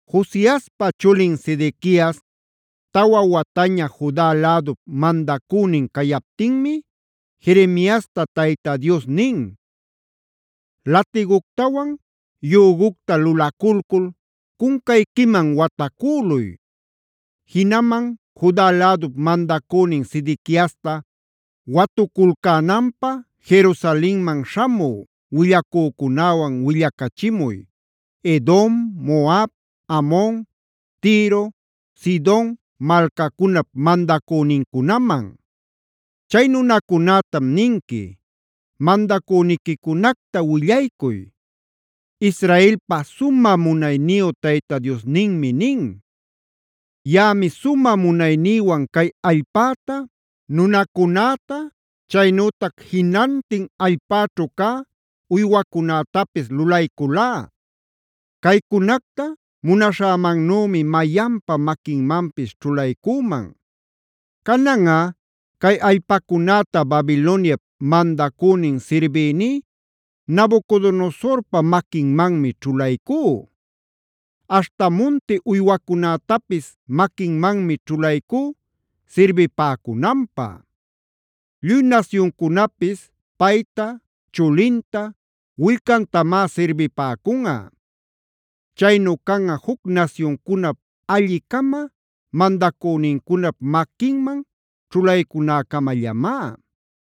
Josiaspa chulin Sedequiasa tawa wataña Juda lädup mandacünin cayaptinmi Jeremiasta Tayta Dios nin: “Latiguctawan yügucta lulaculcul cuncayquiman watacüluy. Jinaman Juda lädup mandacünin Sedequiasta watuculcänanpä Jerusalenman śhamü willacücunäwan willacachimuy Edom, Moab, Amon, Tiro, Sidon malcacunap mandacünincunaman. Chay nunacunätam ninqui: ‘Mandacüniquicunacta willaycuy, Israelpa sumä munayniyu Tayta Diosninmi nin: Yaꞌami sumä munaynïwan cay allpäta, nunacunäta, chaynütac jinantin allpäćhu cä uywacunätapis lulayculá. Caycunacta munaśhämannümi mayanpa maquinmanpis ćhulaycüman. Cananꞌa cay allpacunäta Babiloniap mandacünin sirbïní Nabucodonosorpa maquinmanmi ćhulaycú. Aśhta munti uywacunätapis maquinmanmi ćhulaycú sirbipäcunanpä. Lluy nasyuncunapis payta, chulinta, willcantamá sirbipäcunꞌa. Chaynu canꞌa juc nasyuncunap alli-cama mandacünincunap maquinman ćhulaycunäcamallamá.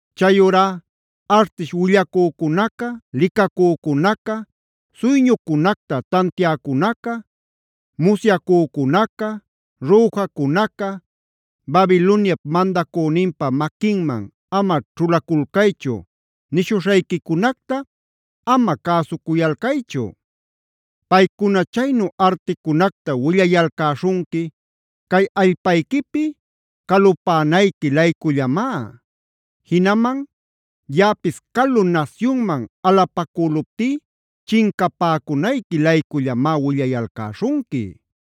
“ ‘Chayurá artish willacücucuna, licacücunaca, suyñucunacta tantiäcunaca, musyacücunaca, rüjacunaca “Babiloniap mandacüninpa maquinman ama ćhulaculcaychu” nishuśhayquicunacta ama cäsucuyalcaychu. Paycuna chaynu articunacta willayalcäśhunqui cay allpayquipi calupänayqui-laycullamá; jinaman yaꞌapis calu nasyunman alapacüluptí chincapäcunayqui-laycullamá willayalcäśhunqui.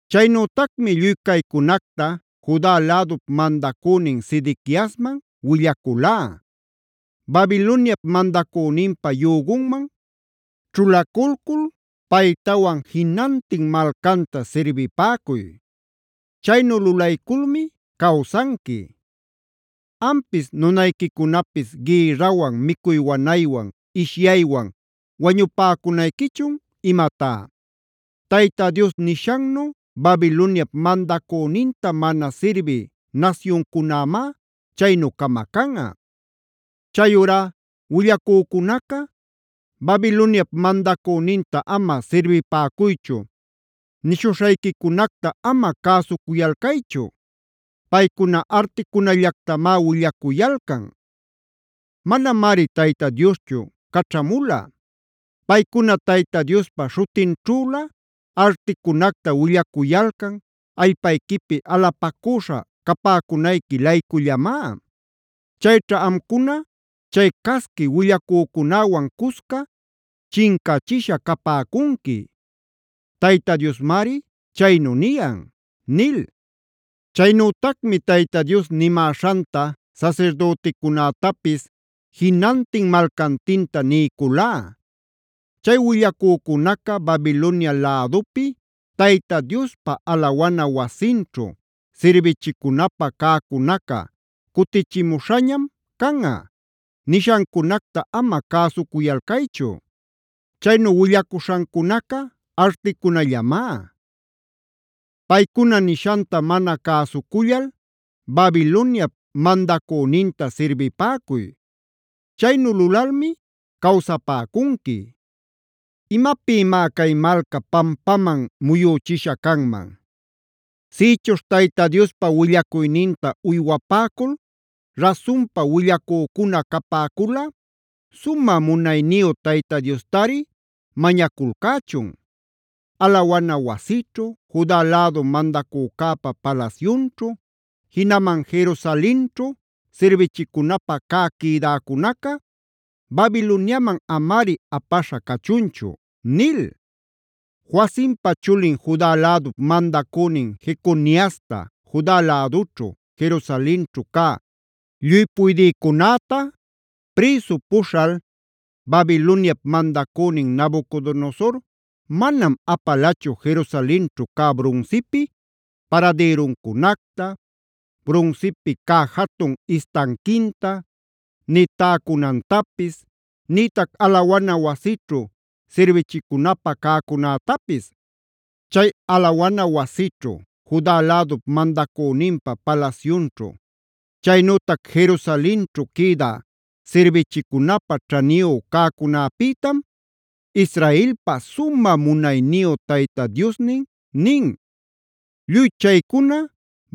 Chaynütacmi lluy caycunacta Juda lädup mandacünin Sedequiasman willaculá: “Babiloniap mandacüninpa yügunman ćhulacul paytawan jinantin malcanta sirbipäcuy. Chaynu lulayculmi cawsanqui. ¿Ampis nunayquicunapis gïrrawan, micuy wanaywan, ishyaywan wañupäcunayquichun imatá? Tayta Dios nishannu Babiloniap mandacüninta mana sirbï nasyuncunämá chaynu camacanꞌa. Chayurá willacücunaca: ‘Babiloniap mandacüninta ama sirbipäcuychu’ nishuśhayquicunacta ama cäsucuyalcaychu. Paycuna articunallactamá willacuyalcan. Manamari Tayta Dioschu caćhamula. Paycuna Tayta Diospa śhutinćhülä articunacta willacuyalcan, allpayquipi alapacüśha capäcunayqui-laycullamá. Chayćha amcuna chay casqui willacücunäwan cusca chincachisha capäcunqui. Tayta Diosmari chaynu niyan” nil. Chaynütacmi Tayta Dios nimäśhanta sasirdüticunätapis jinantin malcantinta niyculá: “Chay willacücunaca ‘Babilonia lädupi Tayta Diospa alawana wasinćhu sirbichicunapä cäcunaca cutichimuśhañam canꞌa’ nishancunacta ama cäsuyalcaychu. Chaynu willacuśhancunaca articunallamá. Paycuna nishanta mana cäsucullal Babiloniap mandacüninta sirbipäcuy. Chaynu lulalmi cawsapäcunqui. ¿Imapïmá cay malca pampaman muyüchisha canman? Sïchuśh Tayta Diospa willacuyninta uywapäcul rasunpa willacücuna capäculꞌa sumä munayniyu Tayta Diostari mañaculcächun: ‘Alawana wasićhu, Juda lädu mandacücäpa palasyunćhu, jinaman Jerusalenćhu sirbichicunapä cä quïdäcunaca Babiloniaman amari apaśha cachunchu’ nil. “Joacimpa chulin Juda lädup mandacünin Jeconiasta,b Juda lädućhu, Jerusalenćhu cä lluy puydïcunäta prïsu puśhal Babiloniap mandacünin Nabucodonosor manam apalachu Jerusalenćhu cä brunsipi paradïruncunacta, brunsipi cä jatun istanquinta, nï täcunantapis, nïtac alawana wasićhu sirbichicunapä cäcunätapis. Chay alawana wasićhu, Juda lädup mandacüninpa palasyunćhu, chaynütac Jerusalenćhu quïda sirbichicunapä ćhaniyu cäcunäpïtam Israelpa sumä munayniyu Tayta Diosnin nin: ‘Lluy chaycuna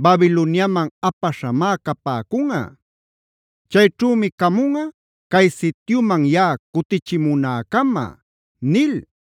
Babiloniaman apaśhamá capäcunꞌa. Chayćhümi camunꞌa cay sityuman yaꞌa cutichimunäcama’” nil.